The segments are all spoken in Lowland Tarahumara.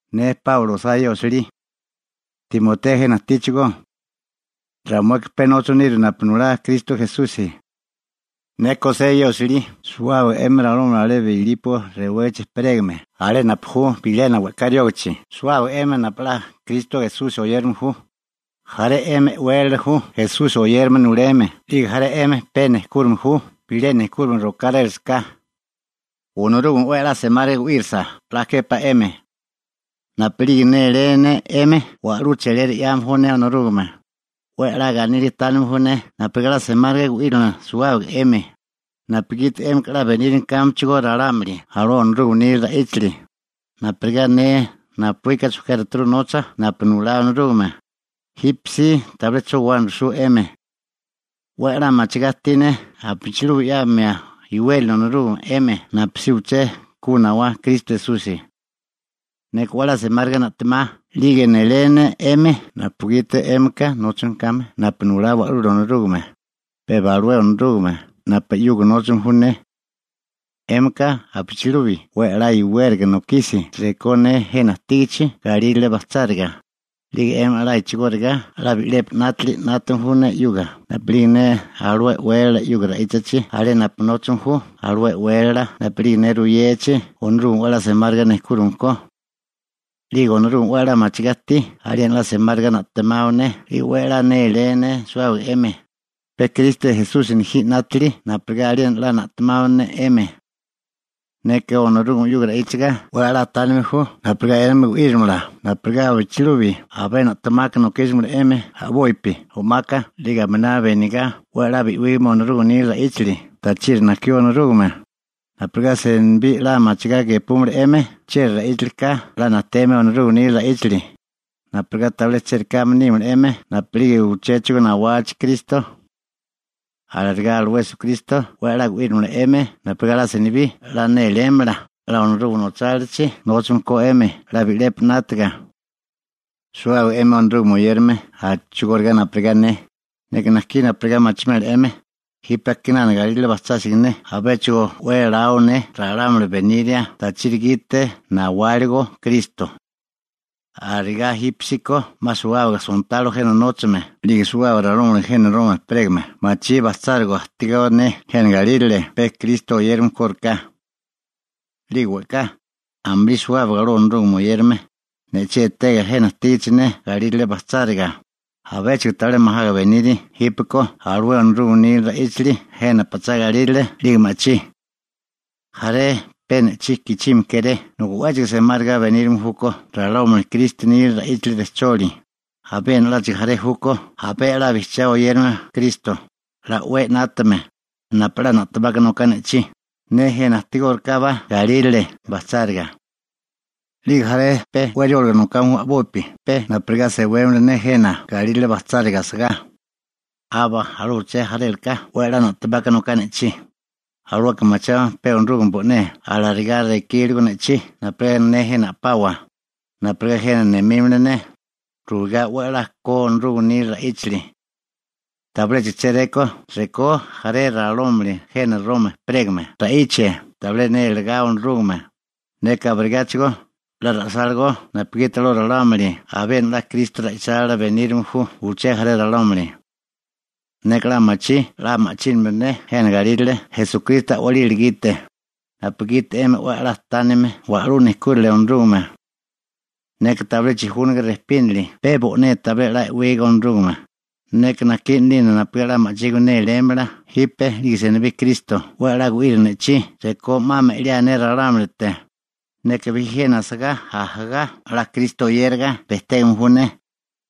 Ne Páulo osá ye osilí. Timoteo jena ajtíchigó. Ramueka pe nóchame niru napu nulá Kristo Esusi. Neka osé ye osilí suwábaga 'emi alé Bilipo rewégachi ejperégame alé napu ju bilena we'ká riógichi suwábaga 'emi ralámuli napu 'la Kristo Esusi oyérame ju. Jaré 'emi e'wélala ju Esusi oyérame nuleme 'lige jaré 'emi pe nejkúrime ju bilé nejkúrime rokárélasaká. Onorúgame 'we a'lá semáriga gu'írisa 'la képá 'emi. Napu'lige néléa ne 'emi, wa'lú cheliera 'yame ju ne Onorúgame. 'We a'lá ganíliga tánime ju ne napurigá 'la semáriga gu'írimala suwábaga 'emi, napugiti 'émika 'la benírame kámechigó ralámuli alué Onorúgame nila ra'íchali, napurigá ne napuíka chojkiárituru nocha napu nulá Onorúgame. Jípesí tabilé 'cho guwana rujsú 'emi. 'We 'la machigá ajtí ne abichilubi 'yamio iwérali Onorúgame 'emi napusí uché ku nawá Kristo Esusi. Neka 'we 'la semáriga na'temá 'lige nélé ne 'emi napugiti 'émika nóchame kame napu nulá Wa'lula Onorúgame, pe aba alué Onorúgame napu 'yuga nóchame ju ne. 'Émika abichilubi 'we a'lá iwériga nokisi rekó ne jena ajtígichi galírale bajcháriga, 'lige 'emi 'la a'chigóriga 'la bi'lepi 'nátali 'nátame ju ne 'yuga napu'lige ne alué e'wélala 'yuga ra'íchachi alé napu nóchame ju alué e'wélala napu'lige ne ruyechi Onorúgame 'we a'lá semáriga nejkúrime ko. 'Lige Onorúgame 'we a'lá machigá ajtí aliena 'la semáriga na'temao ne 'lige 'we néléo ne suwábaga 'emi, pe Kristo Esusi nejí 'nátili napurigá aliena na'temámala ne 'emi. Neka Onorúgame 'yuga ra'íchaga 'we 'la tánime ju napurigá 'emi gu'írimala napurigá abichilubi abé na'temaka nokísimala 'emi a'bopi o'maka 'lige aminabi benigá 'we 'la bi'wígame Onorúgame nila ra'íchali tachiri najkió Onorúgame, napurigá senibí 'la machigá gepúmala 'emi chieri ra'íchali ka 'la najteme Onorúgame nila ra'íchali, napurigá tabilé chérikáme nímala 'emi napu'lige uchéchigo nawachi Kristo. Alarigá alué Esukristo 'we 'la gu'írimala 'emi napurigá 'la senibí 'la nélélamala 'la Onorúgame nochálilachi nóchame ko 'emi 'la bi'lepi 'nátaga. Suwábaga 'emi Onorúgame oyérame a'chigóriga napurigá ne, neka najkí napurigá machimela 'emi, jipe a'kinana galírale bajchásiga ne abéchigo 'we elao ne ralámuli beniria tachiri gite nawáligo Kristo. Arigá jípesíko 'ma suwábaga sontalo jena nóchame 'lige suwábaga ralámuli jena Roma ejperégame machí bajcháriga ajtigó ne jena galírale pe Kristo oyérame kóriká. 'Lige we'ká, amulí suwábaga alué Onorúgame oyérame, ne'chí etega jena ajtígichi ne galírale bajcháriga, abéchigo tabilé majaga beniri jípeko alué Onorúgame nila ra'íchali jena pachá galírale 'lige ma'chí. Jaré pe ne'chí gichime kéré nobi 'wéchigo semáriga benírame júkó ralámuli Kristo nila ra'íchali rejcholi, abiena 'láchigo jaré júkó abé 'la bijchiá 'la oyérame Kristo, 'la o'wé 'nátame, napu 'la na'temaka noká ne'chí, ne jena ajtigórikábá galírale bajcháriga. 'Lige jaré pe 'we rióliga nokame ju a'bopi pe napurigá sewémala ne jena galírale bajcháriga asagá. Aba alué uché jarélaka 'we 'la na'temaka noká ne'chí, alueka machiame pe Onorúgame bo'né alarigá rekíligo ne'chí napurigá ne jena a'pawa, napurigá jena nemímala ne, ruigá 'we a'lá ko Onorúgame nila ra'íchali. Tabiléchigo chéréko rekó jaré ralámuli jena Roma ejperégame ra'ichie tabilé nélegá Onorúgame, neka abirigáchigo 'la ra'sálagó napugiti alué ralámuli abiena 'la Kristo ra'ichálila benírame ju uché jaré ralámuli. Neka 'la machí 'la ma'chínimio ne jena galírale Esukristo a'walila gite, napugiti 'emi 'we 'la tánime wa'lú nejkúrali Onorúgame. Neka tabilé chijúniga rejpínili pe bo'né tabilé 'la e'wiga Onorúgame, neka najkí 'nalina napurigá 'la ma'chígime nélélamala jipe 'lige senibí Kristo 'we 'la gu'irio ne'chí rekó 'ma me'liáe ne ralámulite. Neka bijí jena asagá ajagá 'la Kristo oyériga bejtégame ju ne,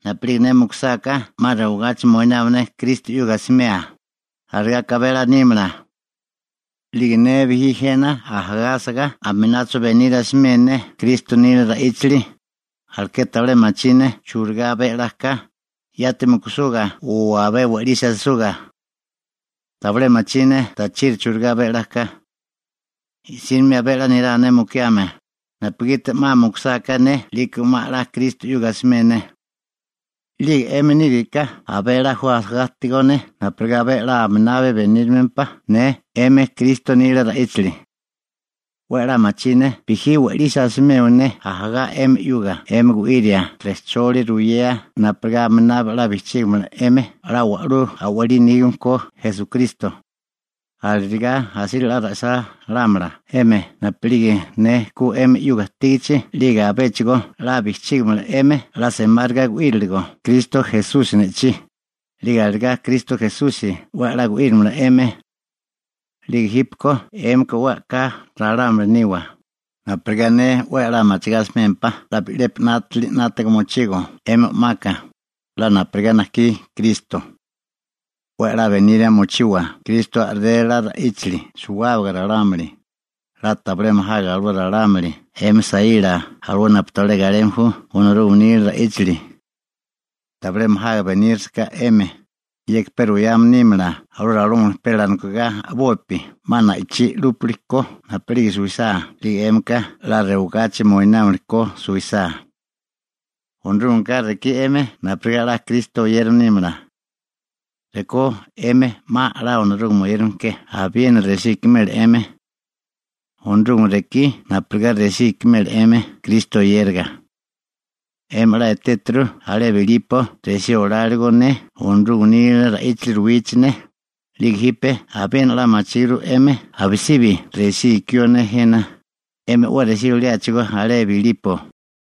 napu'lige ne mukusáká 'ma rewagachi moinámala ne Kristo 'yuga asimea, alarigá ka abé 'la nímala. 'Lige ne bijí jena ajagá asagá aminacho beniria asimela ne Kristo nila ra'íchali, alekeri tabilé machí ne churigá abé a'lá ka, yati mukusuga o abé we'lisi asisuga. Tabilé machí ne tachiri churigá abé 'la ka. I'sínimi abé 'la nerá ne mukiame, napugiti 'ma mukusáká ne 'liko 'ma 'la Kristo 'yuga asimé ne. 'Lige 'emi níriká abé 'la ju ajagá ajtigó ne napurigá abé 'la aminabi benírimempá ne 'emi Kristo nila ra'íchali. 'We 'la machí ne bijí we'lisi asimeo ne ajagá 'emi 'yuga 'emi gu'iria rejcholi ruyea napurigá aminabi 'la bijchígimala 'emi 'la wa'lú a'walí nígame ko Esukristo. Alarigá asíriga 'la ra'sálámala 'emi napu'lige ne ku 'emi 'yuga ajtígichi 'lige abéchigo 'la bijchígimala 'emi 'la semáriga gu'íriligo Kristo Esusi ne'chí, 'lige alarigá Kristo Esusi 'we a'lá gu'írimala 'emi. 'Lige jípeko 'émika 'we a'ká ralámuli niwa, napurigá ne 'we 'la machigá asimémpá 'la bi'lepi 'nátali 'nátaga mochigo 'emi o'maka, 'la napurigá najkí Kristo. 'We a'lá beniria mochiwa Kristo a'rélela ra'íchali suwábaga ralámuli, 'la tabilé majaga alué ralámuli 'emi saíla alué napu tabilé galeme ju Onorúgame nila ra'íchali. Tabilé majaga benírasaká 'emi, yeka pe ruyame nímala alué ralámuli pe alanokigá a'bopi 'ma na'ichí 'lúpili ko napu'lige suwisá 'lige 'émika 'la rewigachi moinámili ko suwisá. Onorúgameka rekí 'emi napurigá 'la Kristo oyérame nímala. Rekó 'emi 'ma 'la Onorúgame oyérame ke abiena resí ikimela 'emi. Onorúgame rekí napurigá resí ikimela 'emi Kristo oyériga. 'Emi 'la etéturu alé Bilipo resí olárigo ne Onorúgame nila ra'íchali ruwichi ne, 'lige jipe abiena 'la machíguru 'emi abisibi resí ikió ne jena, 'emi 'we resí oliáchigó alé Bilipo.